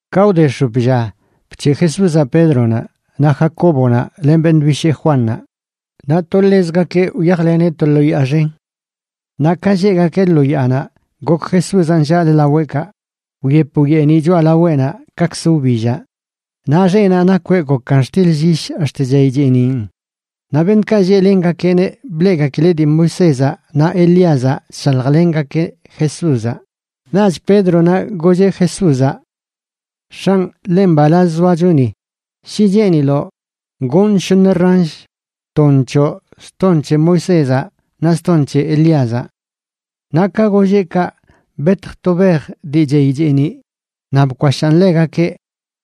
Ka wde x̱op lla, bc̱heꞌ Jesúzaꞌ Pédronaꞌ, naꞌ Jacóbonaꞌ len beṉꞌ bishee Juannaꞌ, naꞌ to ḻezgakeꞌ wyajleneꞌ to lo yaa xen. Naꞌ ka lleꞌgakeꞌ lo yaanaꞌ, gok Jesúzaꞌ nllaꞌlə laweꞌkaꞌ. Wyep wyeeniꞌ choꞌalaweꞌnaꞌ kakzə wbillaꞌ, naꞌ xeꞌnaꞌ nakweꞌ gokan xtil llyish ax̱t chey cheeniꞌn. Naꞌ beṉꞌkaꞌ lleꞌlengakeꞌneꞌ bleꞌgakileꞌ dii Moisézaꞌ naꞌ Elíazaꞌ chshaljlengakeꞌ Jesúzaꞌ. Naꞌch Pédronaꞌ golleꞌ Jesúzaꞌ: ―X̱anꞌ, ḻe mbalaz zoacho ni. Shi cheeniloꞌ, gonꞌ shoṉ ransh, ton choꞌ, ston c̱he Moisézaꞌ naꞌ ston c̱he Elíazaꞌ. Naꞌ ka golleꞌ kaꞌ, betj to bej dii chey cheeniꞌ naꞌ bkwashaan ḻegakeꞌ,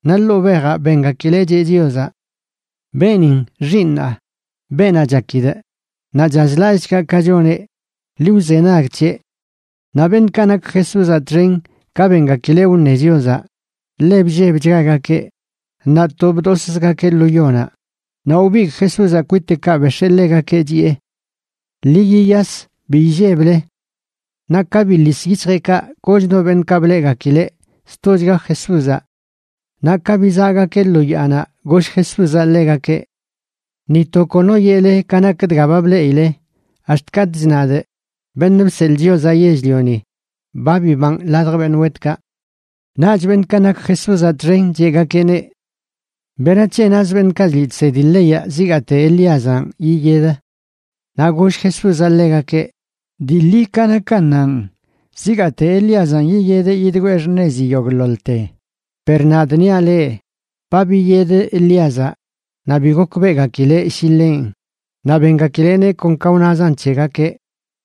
naꞌ ḻoo bejaꞌ bengakileꞌ cheꞌ Chiozaꞌ: ―Beenin Xiiṉaa, beenaꞌ chakidꞌ, naꞌ chazlallꞌchgaꞌ ka choneꞌ. Ḻi wzenag c̱heꞌ. Naꞌ beṉꞌkaꞌ nak Jesúzaꞌ txen, ka bengakileꞌ wṉe Chiozaꞌ, ḻe bllebchgagakeꞌ naꞌ to bdoszgakeꞌ lo yonaꞌ. Naꞌ wbigꞌ Jesúzaꞌ kwiteꞌkaꞌ bex̱ee ḻegakeꞌ, chiꞌe: ―Ḻi yiyas. Bi illeble. Naꞌ ka biḻis yic̱hjeꞌkaꞌ, koch no beṉꞌkaꞌ bleꞌgakileꞌ, stochga Jesúzaꞌ. Naꞌ ka bizaꞌgakeꞌ lo yaanaꞌ goll Jesúzaꞌ ḻegakeꞌ: ―Ni to kono yeꞌle ka nak dga ba bleꞌile ax̱t katꞌch nadꞌ, Beṉꞌ Bseḻꞌ Chiozaꞌ Yell-lioni, ba bibanꞌ ladj beṉꞌ wetkaꞌ. Naꞌch beṉꞌkaꞌ nak Jesúzaꞌ txen cheꞌgakeꞌneꞌ: ―¿Berac̱he naz beṉꞌkaꞌ chliꞌ chsedi leyaꞌ zigaate Elíazanꞌ yiyed? Naꞌ goll Jesúzaꞌ ḻegakeꞌ: ―Dii ḻi ka nakannanꞌ, zigaate Elíazanꞌ yiyedeꞌ yigwee xṉezi yogꞌḻoḻte. Per nadꞌ niaꞌ leꞌ, ba biyed Elíazaꞌ, naꞌ bi gokbeꞌgakileꞌ shi ḻenꞌ. Naꞌ bengakileꞌneꞌ kon ka wnazan c̱hegakeꞌ.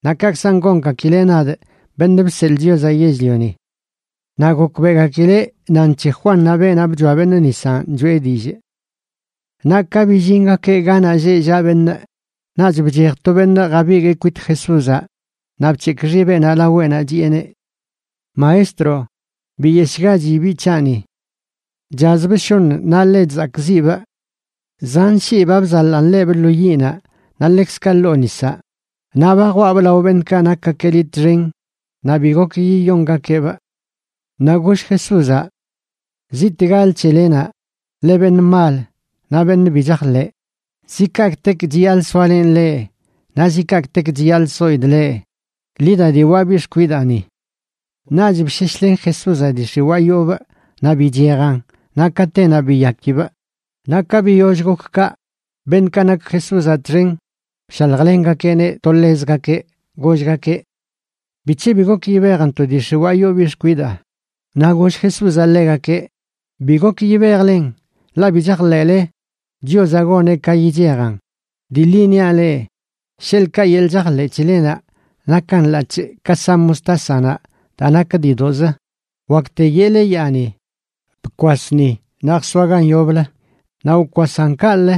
Naꞌ kaꞌkzan gongakileꞌ nadꞌ, Beṉꞌ Bseḻꞌ Chiozaꞌ Yell-lioni. Naꞌ gokbeꞌgakileꞌ nan c̱he Juannaꞌ, beenaꞌ bchoa beṉꞌ nisanꞌ choꞌe dillꞌ. Naꞌ ka billingakeꞌ ganaꞌ lleꞌ llaꞌ beṉꞌ, naꞌch bchej to beṉꞌ jabiguee kwit Jesúzaꞌ naꞌ bc̱hekꞌ xibeꞌnaꞌ laweꞌnaꞌ, chiꞌeneꞌ: ―Maestro, biyeshꞌgachi biꞌ c̱haꞌni. Chazbꞌ shoṉ naꞌ ḻe chzakꞌziꞌbꞌ. Zan shii ba bzaḻaꞌn ḻebꞌ lo yiꞌnaꞌ naꞌ ḻekzkaꞌ ḻoo nisaꞌ. Naꞌ ba jwaꞌbꞌ lao beṉꞌkaꞌ nakgakeꞌ liꞌ txen naꞌ bi gok yiyongakeꞌbꞌ. Naꞌ goll Jesúzaꞌ: ―¡Ziꞌtegalə c̱helenaꞌ, leꞌ beṉꞌ mal naꞌ beṉꞌ bi chajḻeꞌ! ¿Zi kaꞌkꞌtek chiyaḻꞌ soalenꞌ leꞌ? Naꞌ ¿zi kaꞌkꞌtek chiyaḻꞌ soidꞌ leꞌ? Ḻi da diwaꞌ biꞌ xkwidaa ni. Naꞌch bsheshlen Jesúzaꞌ dii x̱iwaa yoobꞌ naꞌ bichejan. Naꞌ katenaꞌ biyakibꞌ. Naꞌ ka biyoll gok kaꞌ, beṉꞌkaꞌ nak Jesúzaꞌ txen bshaljlengakeꞌneꞌ to ḻezgakeꞌ, gollgakeꞌ: ―¿Bic̱he bi gok yibejntoꞌ dii x̱iwaa yoo biꞌ xkwidaa? Naꞌ goll Jesúzaꞌ ḻegakeꞌ: ―Bi gok yibejlen, ḻaꞌ bi chajḻeꞌle Chiozaꞌ goneꞌ ka yichejan. Dii ḻi niaꞌ leꞌ, sheḻꞌkaꞌ yeḻꞌ chajḻeꞌ c̱helenaꞌ nakan ḻaꞌc̱hꞌ ka sa mostásanaꞌ daa nak diidoꞌzə, wakte yeꞌle yaani: “Bkwas ni naꞌ jsoa gan yoblə”, naꞌ wkwasan kaꞌlə.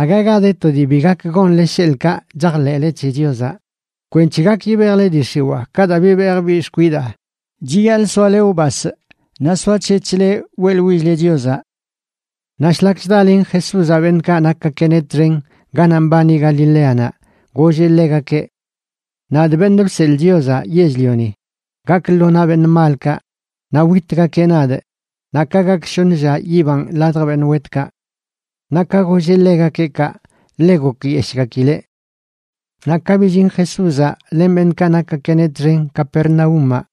Aga ga de to dii bi gak gonle sheḻꞌkaꞌ chajḻeꞌle c̱he Chiozaꞌ. Kwenc̱he gak yibejle dii x̱iwaa ka daa bibejꞌ biꞌ xkwidaa, chiyaḻꞌ soale wbasꞌ naꞌ soac̱hec̱hle weꞌḻwill-le Chiozaꞌ. Naꞌ shlak chdalen Jesúzaꞌ beṉꞌkaꞌ nakgakeꞌneꞌ txen ganaꞌ mbani Galileanaꞌ, golleꞌ ḻegakeꞌ: ―Nadꞌ, Beṉꞌ Bseḻꞌ Chiozaꞌ Yell-lioni, gakꞌ lo naꞌ beṉꞌ malkaꞌ. Naꞌ witgakeꞌ nadꞌ, naꞌ ka gak shoṉ lla yibanꞌ ladj beṉꞌ wetkaꞌ. Naꞌ ka golleꞌ ḻegakeꞌ kaꞌ, ḻe gokyeshꞌgakileꞌ. Naꞌ ka billin Jesúzaꞌ len beṉꞌkaꞌ nakgakeꞌneꞌ txen Capernaúmaꞌ,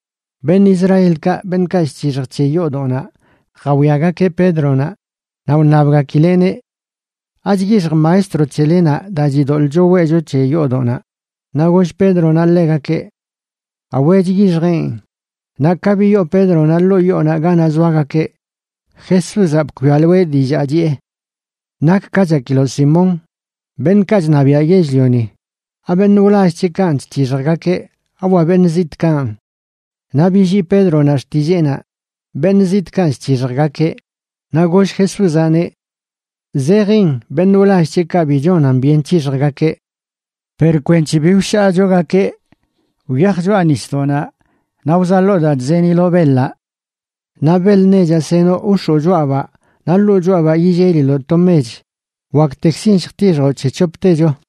beṉꞌ Israelkaꞌ beṉꞌkaꞌ chc̱hixj c̱he yoodoꞌnaꞌ jawiagakeꞌ Pédronaꞌ, naꞌ wṉabgakileꞌneꞌ: ―¿Achyixj maestro c̱helenaꞌ daa chidoḻꞌcho weꞌcho c̱he yoodoꞌnaꞌ? Naꞌ goll Pédronaꞌ ḻegakeꞌ: ―Awe, chyixjeꞌn. Naꞌ ka biyoo Pédronaꞌ ḻoo yoonaꞌ ganaꞌ zoagakeꞌ, Jesúzaꞌ bkwialoeꞌ dillaa chiꞌe: ―¿Nak ka chakiloꞌ, Simón? Beṉꞌkaꞌ chṉabiaꞌ yell-lioni, ¿abeṉꞌ wlall c̱heꞌkanꞌ chc̱hixjgakeꞌ?, ¿awa beṉꞌ zitꞌkanꞌ? Naꞌ billii Pédronaꞌ xtilleenaꞌ: ―Beṉꞌ zitꞌkanꞌ chc̱hixjgakeꞌ. Naꞌ goll Jesúzaꞌneꞌ: ―Zejin beṉꞌ wlall c̱heꞌkaꞌ bi chonan byen c̱hixjgakeꞌ. Per kwenc̱he bi wshaachogakeꞌ, wyaj choꞌa nisdoꞌnaꞌ naꞌ wzaḻoo daa chzeniloꞌ beḻaꞌ. Naꞌ beḻ nechaꞌ senoꞌ wx̱oo choꞌabaꞌ naꞌ ḻoo choꞌabaꞌ yilleliloꞌ to mech. Waktekzin lljtixjoꞌ c̱he c̱hoptecho.